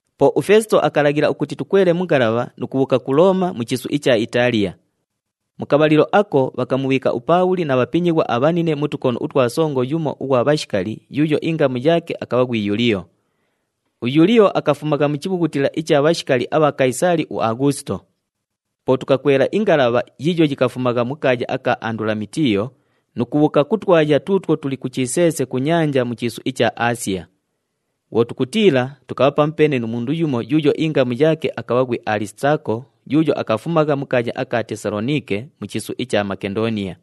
Po uFeesito akalaghila ukuti tukwele mu ngalabha nu kubhuuka ku Looma mu chiisu icha Itaaliya. Mu kabhalilo ako bhakamubhiika uPaabhuli na bhapinyighwa abhanine mu tukono utwa songo yumo ughwa bhashikali yuuyo ingamu yaake akabha ghwi Yuliyo. UYuliyo akafumagha mu chibhughutila icha bhashikali abha Kayisaali uAghuusito. Po tukakwela ingalabha yiiyo yikafumagha mu kaaya aka Andulamitiyo nu kubhuuka ku twaya tuutwo tuli ku chiseese ku nyanja mu chiisu icha Aasiya. Bhwo tukutiila, tukabha pamupeene nu mundu yumo yuuyo ingamu yaake akabha ghwi Alisitaako yuuyo akafumagha mu kaaya aka Tesaloniike mu chiisu icha Makendooniya.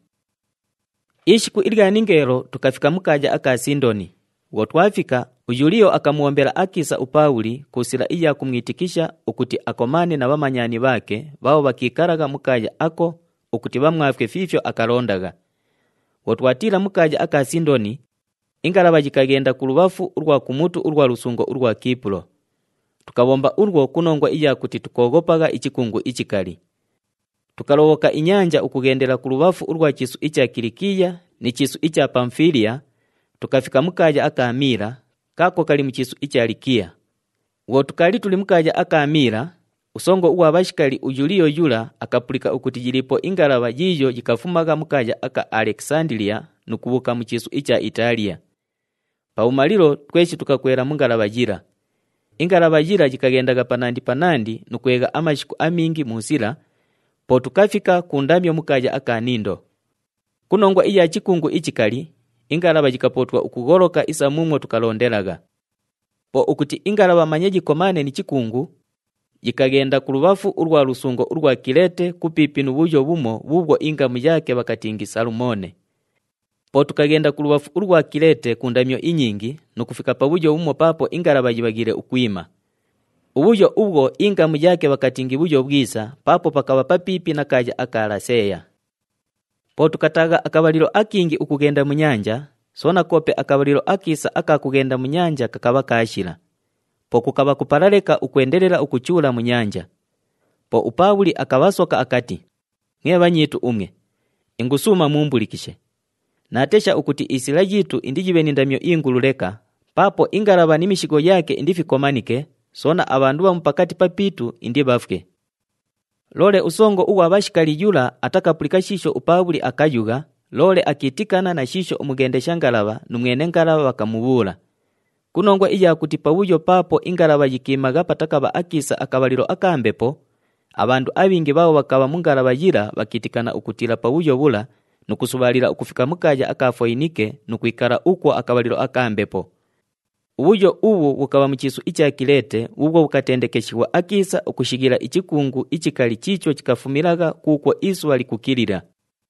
Ishiku ningeelo, tukafika mu kaaya aka Sindoni. Bhwo twafika, uYuliyo akamubhombela akiisa uPaabhuli ku sila iya kumwitikisha ukuti akomaane na bhamanyani bhaake bhaabho bhakiikalagha mu kaaya ako ukuti bhamwafwe fiifyo akalondagha. Bhwo twatiila mu kaaya aka Sindoni, ingalabha yikaghenda kulubhafu ulwa kumutu ulwa lusungo ulwa Kiipulo. Tukabhomba ulwo ku nongwa iya kuti tukooghopagha ichikungu ichikali. Tukalobhoka inyanja ukughendela kulubhafu ulwa chiisu icha Kilikiya ni chiisu icha Pamufiiliya, tukafika mu kaaya aka Miila kaako kali mu chiisu icha Likiya. Bhwo tukaali tuli mu kaaya aka Miila, usongo ughwa bhashikali uYuliyo yula akapulika ukuti yiliipo ingalabha yiiyo yikafumagha mu kaaya aka Alekisandiliya nu kubhuuka mu chiisu icha Itaaliya. Pabhumalilo tweshi tukakwela mu ngalabha yila. Ingalabha yila yikaghendagha panandi panandi nu kwegha amashiku amingi mu sila, po tukafika ku ndamyo mu kaaya aka Nindo. Ku nongwa iya chikungu ichikali, ingalabha yikapootwa ukugholoka isa muumwo tukalondelagha. Po ukuti ingalabha manye yikomaane ni chikungu, yikaghenda kulubhafu ulwa lusungo ulwa Kileete kupiipi nu bhuyo bhumo bhuubhwo ingamu yaake bhakatingi Salumone. Po tukaghenda kulubhafu ulwa Kileete ku ndamyo inyingi nu kufika pabhuyo bhumo paapo ingalabha yibhaghiile ukwima. Ubhuyo ubhwo ingamu yaake bhakatingi Bhuyo Bhwisa paapo pakabha papiipi na kaaya aka Laseeya. Po tukataagha akabhalilo akingi ukughenda mu nyanja, soona koope akabhalilo akiisa aka kughenda mu nyanja kakabha kaashila. Po kukabha kupala leka ukwendelela ukuchuula mu nyanja. Po uPaabhuli akabhasoka akati, “Mwe bhanyiitu umwe, ingusuuma muumbulikishe! Naatesha ukuti isila yiitu indiyibhe ni ndamyo ingulu leka paapo ingalabha ni mishigho yaake indifikomanike, soona abhandu bhamu pakati papiitu indibhafwe.” Loole usongo ughwa bhashikali yula atakapulika shiisho uPaabhuli akayugha, loole akiitikana na shiisho umughendesha ngalabha nu mwene ngalabha bhakamubhuula. Ku nongwa iya kuti pabhuyo paapo ingalabha yikwimagha patakabha akiisa akabhalilo aka mbepo, abhandu abhingi bhaabho bhakabha mu ngalabha yila bhakiitikana ukutiila pabhuyo bhula nu kusubhaalila ukufika mu kaaya aka Foyinike nu kwikala ukwo akabhalilo aka mbepo. Ubhuyo ubhu bhukabha mu chiisu icha Kileete bhuubhwo bhukatendekeshighwa akiisa ukushighila ichikungu ichikali chiicho chikafumilagha kuukwo isubha likukilila.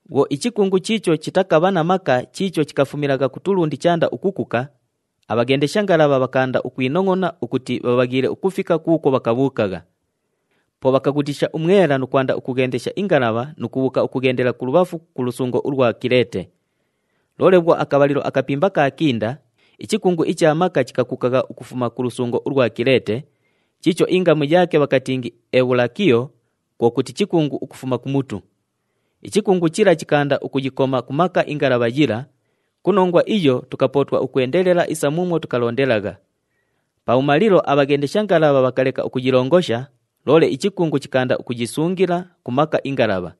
Bhwo ichikungu chiicho chitakabha na maka chiicho chikafumilagha kutulundi chaanda ukukuka, abhaghendesha ngalabha bhakaanda ukwinongʼona ukuti bhabhaghiile ukufika kuukwo bhakabhuukagha. Po bhakaghutiisha umwela nu kwanda ukughendesha ingalabha nu kubhuuka ukughendela kulubhafu ku lusungo ulwa Kileete. Loole bhwo akabhalilo akapimba kaakinda, ichikungu icha maka chikakukagha ukufuma ku lusungo ulwa Kileete, chiicho ingamu yaake bhakatingi Ebhulakilo kwo kuti, “Chikungu ukufuma kumutu.” Ichikungu chila chikaanda ukuyikoma ku maka ingalabha yila, ku nongwa iyo tukapootwa ukwendelela isa muumwo tukalondelagha. Pabhumalilo abhaghendesha ngalabha bhakaleka ukuyilongosha, loole ichikungu chikaanda ukuyisungila ku maka ingalabha.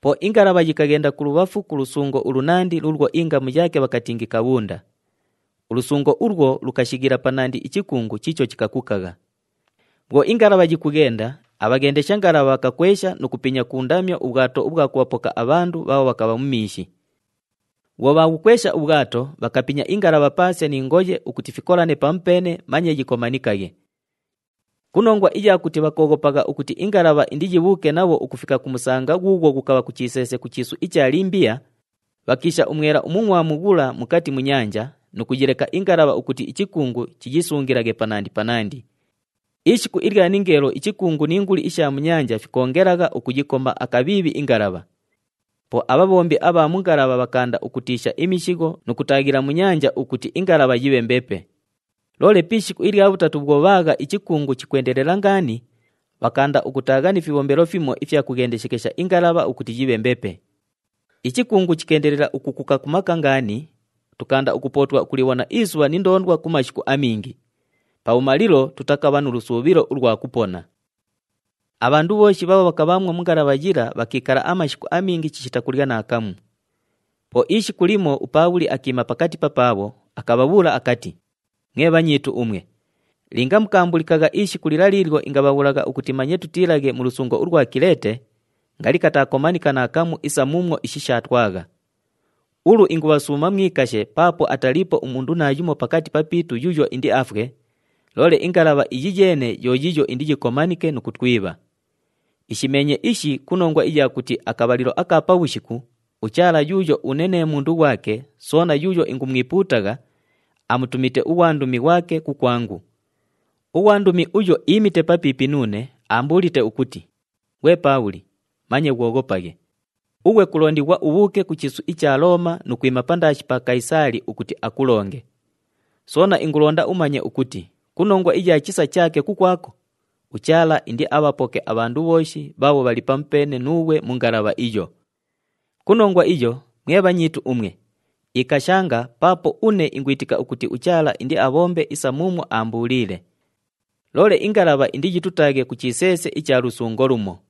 Po ingalabha yikaghenda kulubhafu ku lusungo ulunandi luulwo ingamu yaake bhakatingi Kabhunda. Ulusungo ulwo lukashighila panandi ichikungu chiicho chikakukagha. Bhwo ingalabha yikughenda, abhaghendesha ngalabha bhakakwesha nu kupinya ku ndamyo ubhwato ubhwa kubhapoka abhandu bhaabho bhakabha mu miishi. Bhwo bhaabhukwesha ubhwato, bhakayipinya ingalabha paase ni ngoye ukuti fikolane pamupeene manye yikomanikaghe. Ku nongwa iya kuti bhakooghopagha ukuti ingalabha indiyibhuuke nabho ukufika ku musanga ghuughwo ghukabha ku chiseese ku chiisu icha Limbiya, bhakiisha umwela umungʼwamu ghula mukati mu nyanja nu kuyileka ingalabha ukuti ichikungu chiyisungilaghe panandi panandi. Ishiku ilya ningeelo ichikungu ni nguli isha mu nyanja fikoongelagha ukuyikoma akabhiibhi ingalabha. Po abhabhombi abha mu ngalabha bhakaanda ukutiisha imishigho nu kutaaghila mu nyanja ukuti ingalabha yibhe mbepe. Loole pi ishiku ilya bhutatu bhwo bhaagha ichikungu chikwendelela ngaani, bhakaanda ukutaagha ni fibhombelo fimo ifya kughendeshekesha ingalabha ukuti yibhe mbepe. Ichikungu chikeendelela ukukuka ku maka ngaani, tukaanda ukupootwa ukulibhona isubha ni ndoondwa ku mashiku amingi. Pabhumalilo tutakabha nu lusuubhilo ulwa kupona. Abhandu bhooshi bhaabho bhakabhaamwo mu ngalabha yila bhakiikala amashiku amingi chishita kulya naakamu. Po ishiku limo uPaabhuli akiima pakati papaabho, akabhabhuula akati, “Mwe bhanyiitu umwe, linga mukaambulikagha ishiku lila liilyo ingabhabhuulagha ukuti manye tutiilaghe mu lusungo ulwa Kileete, ngali katakomanika naakamu isa muumwo ishi shaatwagha. Ulu ingubhasuuma mwikashe paapo ataliipo umundu naayumo pakati papiitu yuuyo indiafwe, loole ingalabha iyi yeene yo yiiyo indiyikomanike nu kutwibha. Ishimeenye ishi ku nongwa iya kuti akabhalilo aka pabhushiku uChaala yuuyo une nee mundu ghwake soona yuuyo ingumwipuutagha, amutumite ughwandumi ghwake kukwangu. Ughwandumi uyo iimite papiipi nuune, aambuulite ukuti, ‘Ghwe Paabhuli, manye ghwoghopaghe! Ughwe kulondighwa ubhuuke ku chiisu icha Looma nu kwima pandaashi pa Kayisaali ukuti akulonge. Soona ingulonda umanye ukuti ku nongwa iya chisa chaake kukwako, uChaala indiabhapoke abhandu bhooshi bhaabho bhali pamupeene nuughwe mu ngalabha iyo.’ Ku nongwa iyo, mwe bhanyiitu umwe, ikashanga paapo une ingwitika ukuti uChaala indiabhombe isa muumwo aambuuliile. Loole ingalabha indiyitutaaghe ku chiseese icha lusungo lumo.”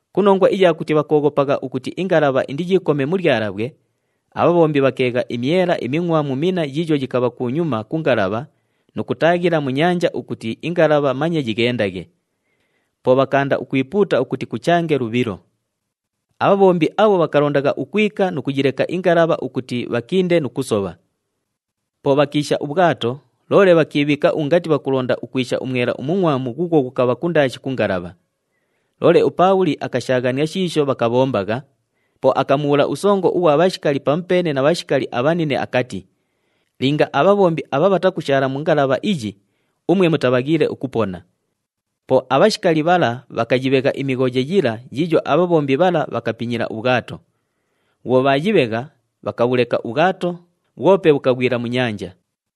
Ku nongwa iya kuti bhakooghopagha ukuti ingalabha indiyiikome mu lyalabhwe, abhabhombi bhakeegha imyela imingʼwamu minna yiiyo yikabha kunyuma ku ngalabha nu kutaaghila mu nyanja ukuti ingalabha manye yighendaghe. Po bhakaanda ukwipuuta ukuti kuchange lubhilo. Abhabhombi abho bhakalondagha ukwika nu kuyileka ingalabha ukuti bhakinde nu kusobha. Po bhakiisha ubhwato loole bhakiibhiika ungati bhakulonda ukwisha umwela umungʼwamu ghuughwo ghukabha kundaashi ku ngalabha. Loole uPaabhuli akashaaghania shiisho bhakabhombagha, po akamubhuula usongo ughwa bhashikali pamupeene na bhashikali abhanine akati, “Linga abhabhombi abha bhatakushaala mu ngalabha iyi, umwe mutabhaghiile ukupona.” Po abhashikali bhala bhakayibhegha imighoye yila yiiyo abhabhombi bhala bhakapinyila ubhwato. Bhwo bhaayibhegha, bhakabhulekela ubhwato, bhwope bhukaghwila mu nyanja.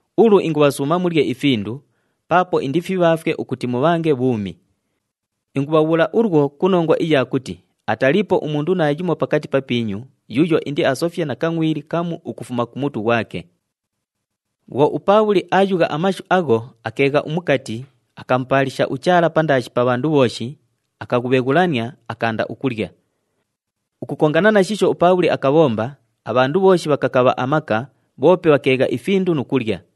Ulu ingubhasuuma mulye ifindu paapo indifibhaafwe ukuti mubhange bhuumi. Ingubhabhuula ulwo ku nongwa iya kuti ataliipo umundu naayumo pakati papiinyu yuuyo indiasofye na kangʼwili kamu ukufuma ku mutu ghwake.” Bhwo uPaabhuli aayugha amashu agho, akeegha umukati, akamupaalisha uChaala pandaashi pa bhandu bhooshi, akaghubheghulania, akaanda ukulya. Ukukongana na shiisho uPaabhuli akabhomba, abhandu bhooshi bhakakabha amaka, bhoope bhakeegha ifindu nu kulya.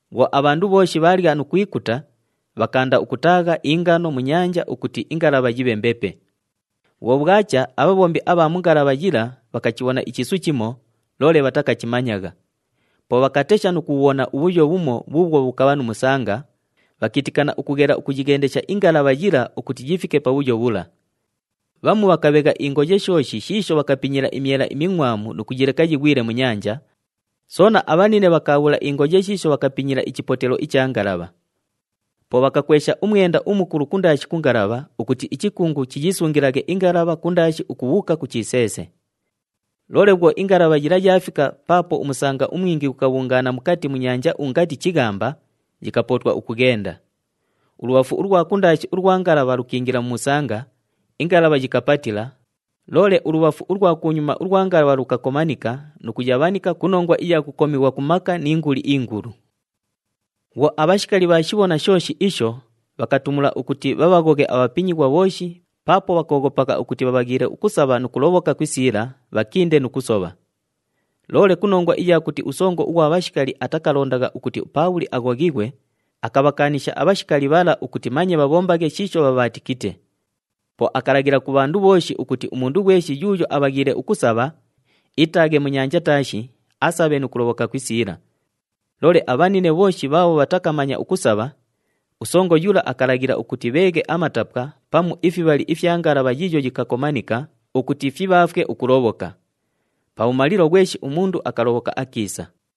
Bhwo abhandu bhooshi bhaalya nu kwikuta, bhakaanda ukutaagha ingano mu nyanja ukuti ingalabha yibhe mbepe. Bhwo bhwacha, abhabhombi abha mu ngalabha yila bhakachibhona ichiisu chimo, loole bhatakachimanyagha. Po bhakatesha nu kubhubhona ubhuyo bhumo bhuubhwo bhukabha nu musanga, bhakiitikana ukughela ukuyighendesha ingalabha yila ukuti yifike pabhuyo bhula. Bhamu bhakabhegha ingoye shooshi shiisho bhakapinyila imyela imingʼwamu nu kuyileka yighwile mu nyanja, soona abhanine bhakaabhula ingoye shiisho bhakapinyila ichipotelo icha ngalabha. Po bhakakwesha umwenda umukulu kundaashi ku ngalabha ukuti ichikungu chiyisungilaghe ingalabha kundaashi ukubhuuka ku chiseese. Loole bhwo ingalabha yila yaafika paapo umusanga umwingi ghukabhungaana mukati mu nyanja ungati chighamba, yikapootwa ukughenda. Ulubhafu ulwa kundaashi ulwa ngalabha lukiingila mu musanga, ingalabha yikapatila, loole ulubhafu ulwa kunyuma ulwa ngalabha lukakomanika nu kuyabhanika ku nongwa iya kukomighwa ku maka ni nguli ingulu. Bhwo abhashikali bhaashibhona shooshi isho, bhakatumula ukuti bhabhaghoghe abhapinyighwa bhooshi paapo bhakooghopagha ukuti bhabhaghiile ukusabha nu kulobhoka ku isiila, bhakinde nu kusobha. Loole ku nongwa iya kuti usongo ughwa bhashikali atakalondagha ukuti uPaabhuli aghoghighwe, akabhakaanisha abhashikali bhala ukuti manye bhabhombaghe shiisho bhabhaatikite. Po akalaghila ku bhandu bhooshi ukuti umundu ghweshi yuuyo abhaghiile ukusabha, iitaaghe mu nyanja taashi, asabhe nu kulobhoka ku isiila. Loole abhanine bhooshi bhaabho bhatakamanya ukusabha, usongo yula akalaghila ukuti bheeghe amatapwa pamu ifibhali ifya ngalabha yiiyo yikakomanika ukuti fibhaafwe ukulobhoka. Pabhumalilo ghweshi umundu akalobhoka akiisa.